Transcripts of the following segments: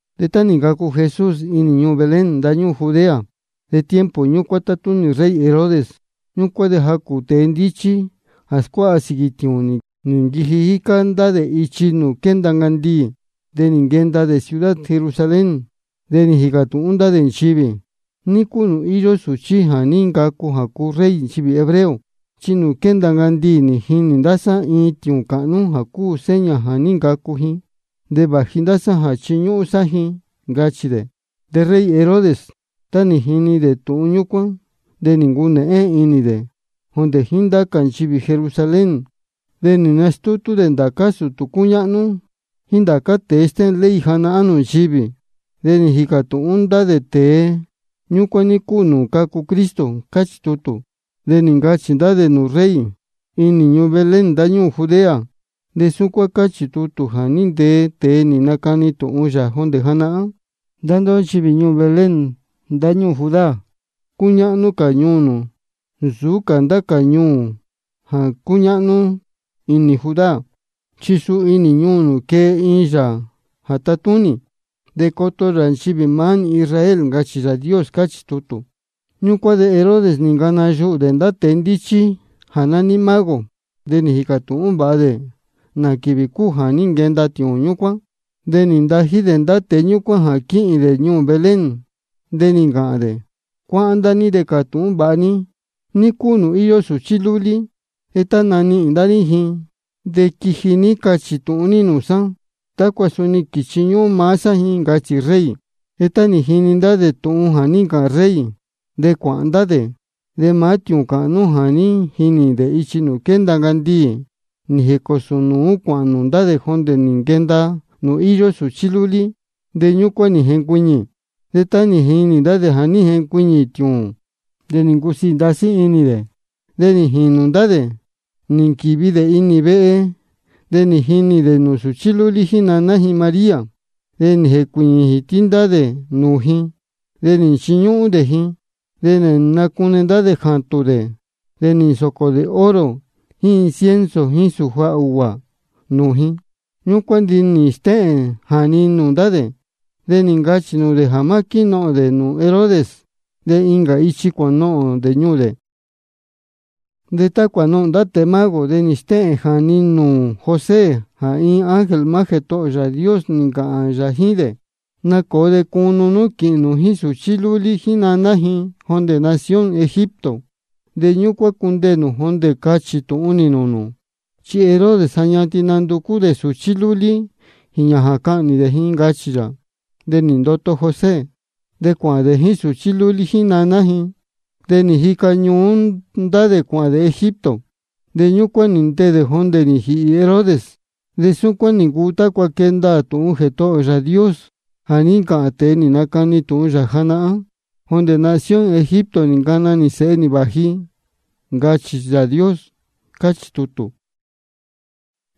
De tá nī ncacu Jesús inī ñuū Belén ndáñúū Judea, de tiempo ñúcuán tátúnī rey Herodes. Ñúcuán de jacū tēe ndíchí jā scuáha sīquī tiūūn, nī nquiji jícá ndá dē ichi nūū quénda ncandiī, de nī nquenda dē ciudad Jerusalén. De nī jīcā tūhún ndá dē nchivī: ¿Ní cúu nūū íyó sūchí jā ní ncacu jā cuu rey nchivī hebreo? Chi ichi nūū quénda ncandiī nī jinī ndá sá iin tiūūn cāhnú jā cúu seña jā ní ncacu ji. De vāji ndá sá jā chiñúhún sá ji, ncachī dē. De rey Herodes, tá nī jini dē tūhun ñúcuán, de nī ncunēhén inī dē, jondē jíín ndācá nchivī Jerusalén. De nī nastútú dē ndācá sūtū cúñáhnú jíín ndācá tēe stéhēn ley janahán nūū nchivī. De nī jīcā tūhún dē ndá tēe ñúcuán ní cúu nūū cacu Cristo, cáchī tutū. De nī ncachī ndá dē nūū rey: Inī ñuū Belén ndáñúū Judea. Chi súcuán cáchī nūū tútū jā ní ntee tēe nī nacani tūhun yā jondē janahán: Ndá ndóhó nchivī ñuū Belén ndáñúū Judá, cúñáhnú cā ñuū nū nsūú cā ndá cā ñuū jā cúñáhnú inī Judá. Chi suu inī ñuū nū quee iin Yāā jā tatúnī, de coto yā nchivī maá nī Israel, ncachī Yāā Dios. Cáchī tutū. Ñúcuán de Herodes nī ncana yuhū dē ndá tēe ndíchí jā nání mago. De nī jīcā tūhún vāha dē nā quīvī cúu jā ní nquenda tiūūn ñúcuán. De nī ntají dē ndá tēe ñúcuán jā quíhīn dē ñuū Belén. De nī ncāhān dē: Cuáhán ndá ní de cātūhún vāha ní ní cúu nūū íyó sūchí lúlí. De tá nī nanihīn ndá ní ji, de quiji ní cachī tūhun ní nūū sá, tácua suni quīchiñúhún maá sá ji, ncachī rey. De tá nī jini ndá dē tūhun jā ní ncāhān rey, de cuāhān ndá dē. De maá tiūūn cāhnú jā ní jinī dē ichi nūū quénda ncandiī, nī jēcōsō nūú cuāhān nūū ndá dē jondē nī nquenda nūū íyó sūchí lúlí, de ñúcuán nī jencuiñī. De tá nī jinī ndá dē jā ní jencuiñī tiūūn, de nī ncusiī ndasí inī dē. De nī jīnū ndá dē nī nquīvi dē inī vehe, de nī jinī dē nūū sūchí lúlí jíín naná ji María. De nī jēcuīñī jītí ndá dē nūū ji, de nī nchiñúhún dē ji. De nī nacune ndá dē jātūn dē, de nī nsōcō dē oro jíín incienso jíín sūja ūguā nūū ji. Ñúcuán de nī stéhēn jāni nūū ndá dē, de nī ncachī nūū dē jā má quínohōn dē nūū Herodes. De incā ichi cuānohōn dē ñuū dē. De tá cuānohōn ndá tēe mago, de nī stéhēn jāni nūū José jā iin ángel maá Jētohō ō Yāā Dios nī ncāhān yā jíín dē: Nacōo de cunu nú quīhīn nū jíín sūchí lúlí jíín naná ji jondē nación Egipto. De ñúcuán cundeē nū jondē cachī tūhun nī nūū nū. Chi Herodes ja ñatin nanducú dē sūchí lúlí jīñā jā cahnī dē ji, ncachī yā. De nī ndoto José. De cuāhān dē jíín sūchí lúlí jíín naná ji, de nī jica ñuú ndá dē cuāhān dē Egipto. De ñúcuán nī ndeē dē jondē nī jīhī Herodes. De súcuán nī ncuu tácua quee ndaā tūhun Jētohō ō Yāā Dios jā ní ncāhān tēe nī nacani tūhun yā janahán: Jondē nación Egipto nī ncana nī Sēhe nī vāji ji, ncachī Yāā Dios, cáchī tutū.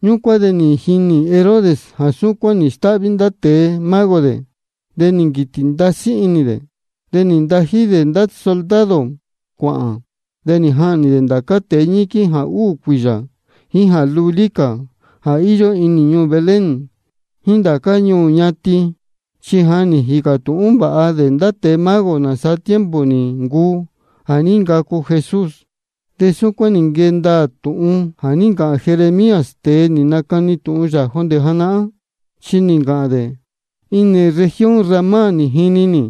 Ñúcuán de nī jinī Herodes jā súcuán nī stáhví ndá tēe mago dē, de nī nquītī ndasí inī dē. De nī ntají dē ndá soldado cuāhān, de nī jahnī ndācá tēe ñiquín jā úū cuīyā jíín jā lūlí cā jā íyó inī ñuū Belén jíín ndācá ñuū ñatin. Chi ja nī jīcā tūhún vāha dē ndá tēe mago nāsaa tiempo nī ncuu jā ní ncacu Jesús. De súcuán nī nquee ndaā tūhun jā ní ncāhān Jeremías, tēe nī nacani tūhun yā jondē janahán, chi nī ncāhān dē: Inī región Ramá nī jini nī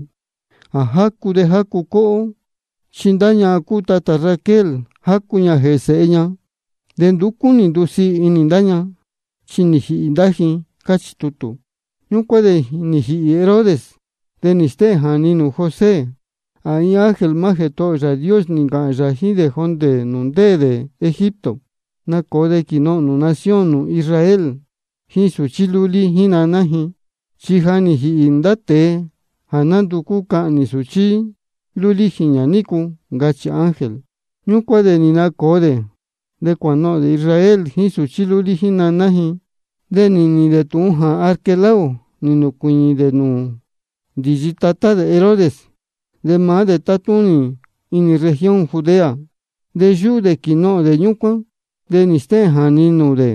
jā jácu de jácu cóhó. Chi ndá ñahan cúu tatā Raquel, jácu ña jēhē sēhe ña, de nduú cúnī ndusiī inī ndá ña, chi nī jīhī ndá ji. Cáchī tutū. Ñúcuán de nī jīhī Herodes. De nī stéhēn jāni nūū José jā iin ángel Jētohō ō Yāā Dios nī ncāhān yā jíín dē jondē nūū ndéē dē Egipto: Nacōo de quīnohōn nū nación nū Israel jíín sūchí lúlí jíín naná ji. Chi ja nī jīhī ndá tēe jā ndúcú cahnī sūchí lúlí jīñā nícu, ncachī ángel. Ñúcuán de nī nacōo dē, de cuānohōn dē Israel jíín sūchí lúlí jíín naná ji. De nī nīhīn dē tūhun jā Arquelao nī nūcuīñī dē nūū ndīyi tatá dē Herodes, de maá dē tátúnī inī región Judea. De yúhú dē jā quínohōn dē ñúcuán. De nī stéhēn jāni nūū dē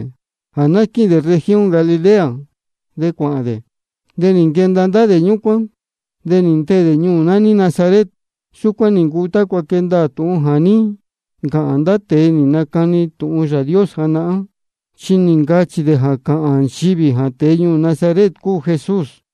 jā ná quíhīn dē región Galilea, de cuāhān dē. De nī nquenda ndá dē ñúcuán, de nī ndeē dē ñuū nání Nazaret. Súcuán nī ncuu tácua quee ndaā tūhun jā ní ncāhān ndá tēe nī nacani tūhun Yāā Dios janahán. Chi nī ncachī dē jā cāhān nchivī jā tēe ñuū Nazaret cúu Jesús.